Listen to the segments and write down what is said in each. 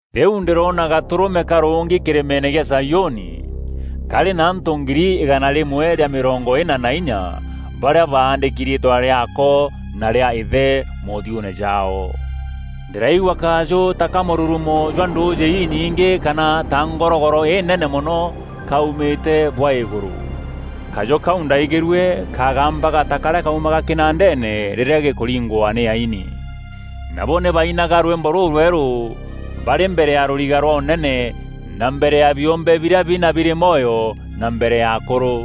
Rîu ndîroona Gatûrûme karûngi kîrîmeene gîa Zaiûni karî na antû ngiri îgana rîmwe rîa mîrongo îna na inya barîa baandîki riîtwa rîaako na rîa Îthe moothiûûne jaao. Ndîraigua kajû ta ka mûrurumo jwa ndûûjî inyingî kana ta ngorogoro înene mono kaumîte bwa îgûrû. Kajû kau ndaaigîrue kagambaga ta karîa kaumaga kînandeene rîrîa gîkûringwa nî aini. Nabo nî baainaga rwîmbo rûrwerû barî mbere ya rûriga rwa ûnene na mbere ya biûmbe birîa bina birî mwoyo na mbere ya akûrû.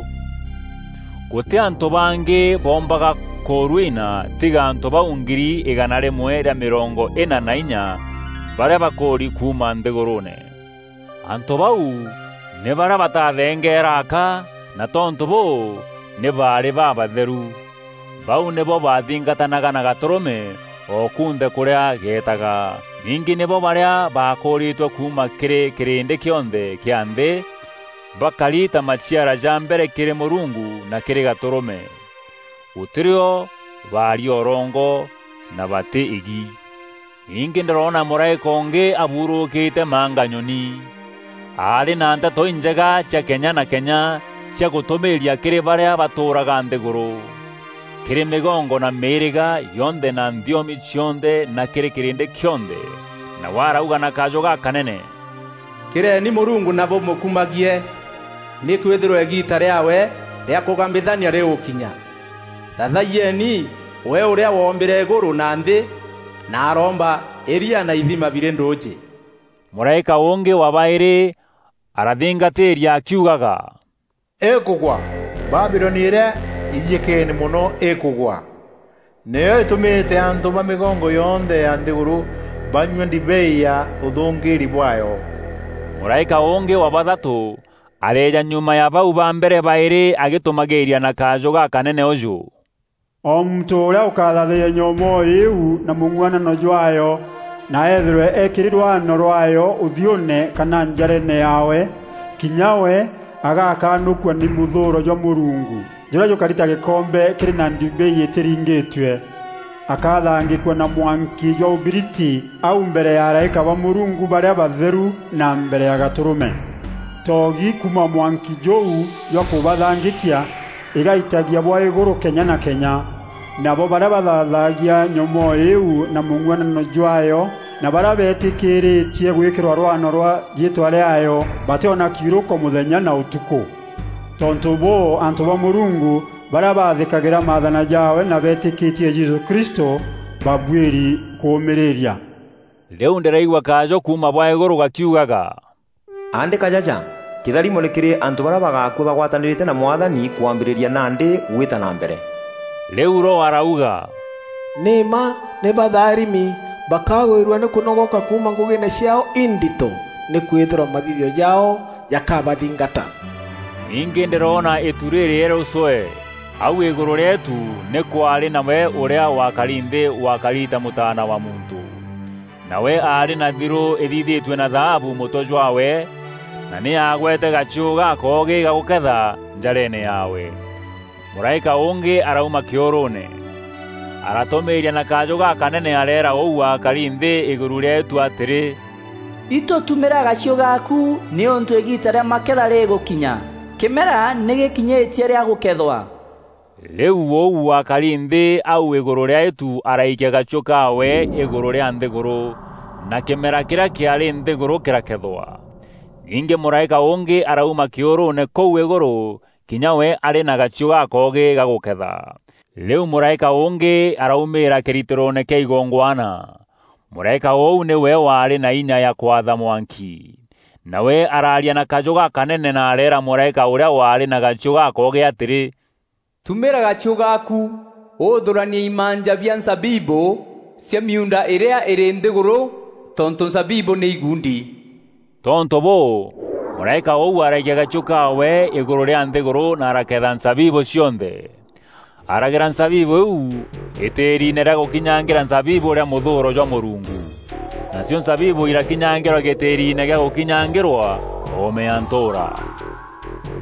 Gûtî antû bangî boombaga kûrwina tiga antû bau ngiri îgana rîmwe rîa mîrongo îna na inya barîa bakûûri kuuma nthîgûrûûne. Antû bau nî barîa batathengeera aka, na tontû bûû nî baarî babatheru. Bau nîbo baathingatanaga na Gatûrûme o kunthe kûrîa geetaga. Ningî nîbo barîa baakûûrîtwe kuuma kîrî kîrîndî kîonthe kîa nthî, bakari ta maciara ja mbere kîrî Mûrungu na kîrî Gatûrûme. Gûtîrio baaria ûrongo na batî îgi. Ningî ndîroona mûraîka ûngî aburûûkîrîte manganyoni. Aarî na Nteto Injega cia kenya na kenya cia gûtûmîîria kîrî barîa batûûraga nthîgûrû: kîrî mîgongo na mîîrîga yonthe na nthiomi cionthe na kîrî kîrîndî kîonthe. Nawe arauga na kajû gakanene, “Kîreni Mûrungu na bûmûkumagie! Nîkwîthîrwa îgiita rîaawe rîa kûgambithania rîgûkinya. Thaathayieni we ûrîa wombîre îgûrû na nthî na aroomba îria na ithima birî ndûûjî.” Mûraîka ûngî wa baîrî arathingatîîria akiugaga, “Îkûgwa, Babiloni îrîa ijîkeene mono îkûgwa. Nîyo îtûmîte antû ba mîgongo yonthe ya nthîgûrû banyua ndibei ya ûthûngîîri bwaayo!” Mûraîka ûngî wa bathatû areeja nyuma ya bau ba mbere baîrî agîtûmagîîria na kajû gakanene ûjû, “O muntû ûrîa ûkathaathayia nyomoo îîu na mûng'uanano jwaayo na eethîrwe eekîri rwano rwaayo ûthiûûne kana njareene yaawe, kinya we agakanûkua nî mûthûûro jwa Mûrungu jûrîa jûkari ta gîkombe kîrî na ndibei îtîringîtue. Akathangîkua na mwanki jwa ûbiriti au mbere ya araîka ba Mûrungu barîa batheru na mbere ya Gatûrûme. Toogi kuuma mwanki jûu jwa kûbathangîkia îgaitagia bwa îgûrû kenya na kenya. Nabo barîa bathaathagia nyomoo îîu na mûng'uanano jwaayo na barîa beetîkîîrîtie gwîkîrwa rwano rwa riîtwa rîaayo, batîona kiûrûko mûthenya na ûtukû.” Tontû bûû antû ba Mûrungu, barîa bathîkagîra maathana jaawe na beetîkîtie Jesû Kristû, babuîri kûûmîrîria. Rîu ndîraigua kajû kuuma bwa îgûrû gakiugaga, “Aandîka jaja: Kîtharimo nî kîrî antû barîa bagakua bagwatanîrîte na Mwathani kwambîrîria nandî gwîta na mbere.” Rîu Roho arauga, “Nî mma nî baatharimi! Bakagwîrua nî kûnogoka kuuma ngûgîîne ciaao indito. Nîkwîthîrwa mathithio jaao jakabathingata.” Ningî ndîroona îtu rîrîerû cwee. Au îgûrû rîa îtu nî kwaarî na we ûrîa wakari nthî wakari ta Mûtaana wa Muntû. Nawe aarî na thirû ithithîtue na thaabu mûtwe jwaawe na nî aagwete gachiû gakoogî ga gûketha njareene yaawe. Mûraîka ûngî arauma kîûrûûne. Aratûmîîria na kajû gakanene areera ûu wakari nthî îgûrû rîa îtu atîrî, “Itû tûmîra gachiû gaaku nîûntû îgiita rîa maketha rîgûkinya. Kîmera nî gîkinyîtie rîa gûkethwa.” Rîu ûu wakari nthî au îgûrû rîa îtu araikia gachiû kaawe îgûrû rîa nthîgûrû, na kîmera kîrîa kîaarî nthîgûrû kîrakethwa. Ningî mûraîka ûngî arauma kîûrûûne kûu Îgûrû kinya we arî na gachiû gakoogî ga gûketha. Rîu mûraîka ûngî araumîîra kîritîroone kîa igongwana. Mûraîka ûu nîwe waarî na inya ya kwatha mwanki. Nawe araaria na kajû gakanene na areera mûraîka ûrîa waarî na gachiû gakoogî atîrî, “Tumîra gachiû gaaku, ûthûranie imanja bia nzabibû cia miuunda îrîa îrî nthîgûrû tontû nzabibû nî iguundi.” Tontû bûû mûraîka ûu araikia gachiû kaawe îgûrû rîa nthîgûrû na araketha nzabibû cionthe. Aragera nzabibû iu îtîîrine rîa gûkinyangîra nzabibû rîa mûthûûro jwa Mûrungu. Nacio nzabibû irakinyangîrwa gîtîîrine gîa gûkinyangîrwa oome ya ntûûra.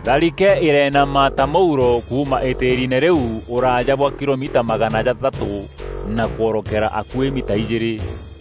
Tharike îreenama ta mûuro kuuma îtîîrine rîu ûraaja bwa kilomita magana jathatû na kworokera akuî mita ijîîrî.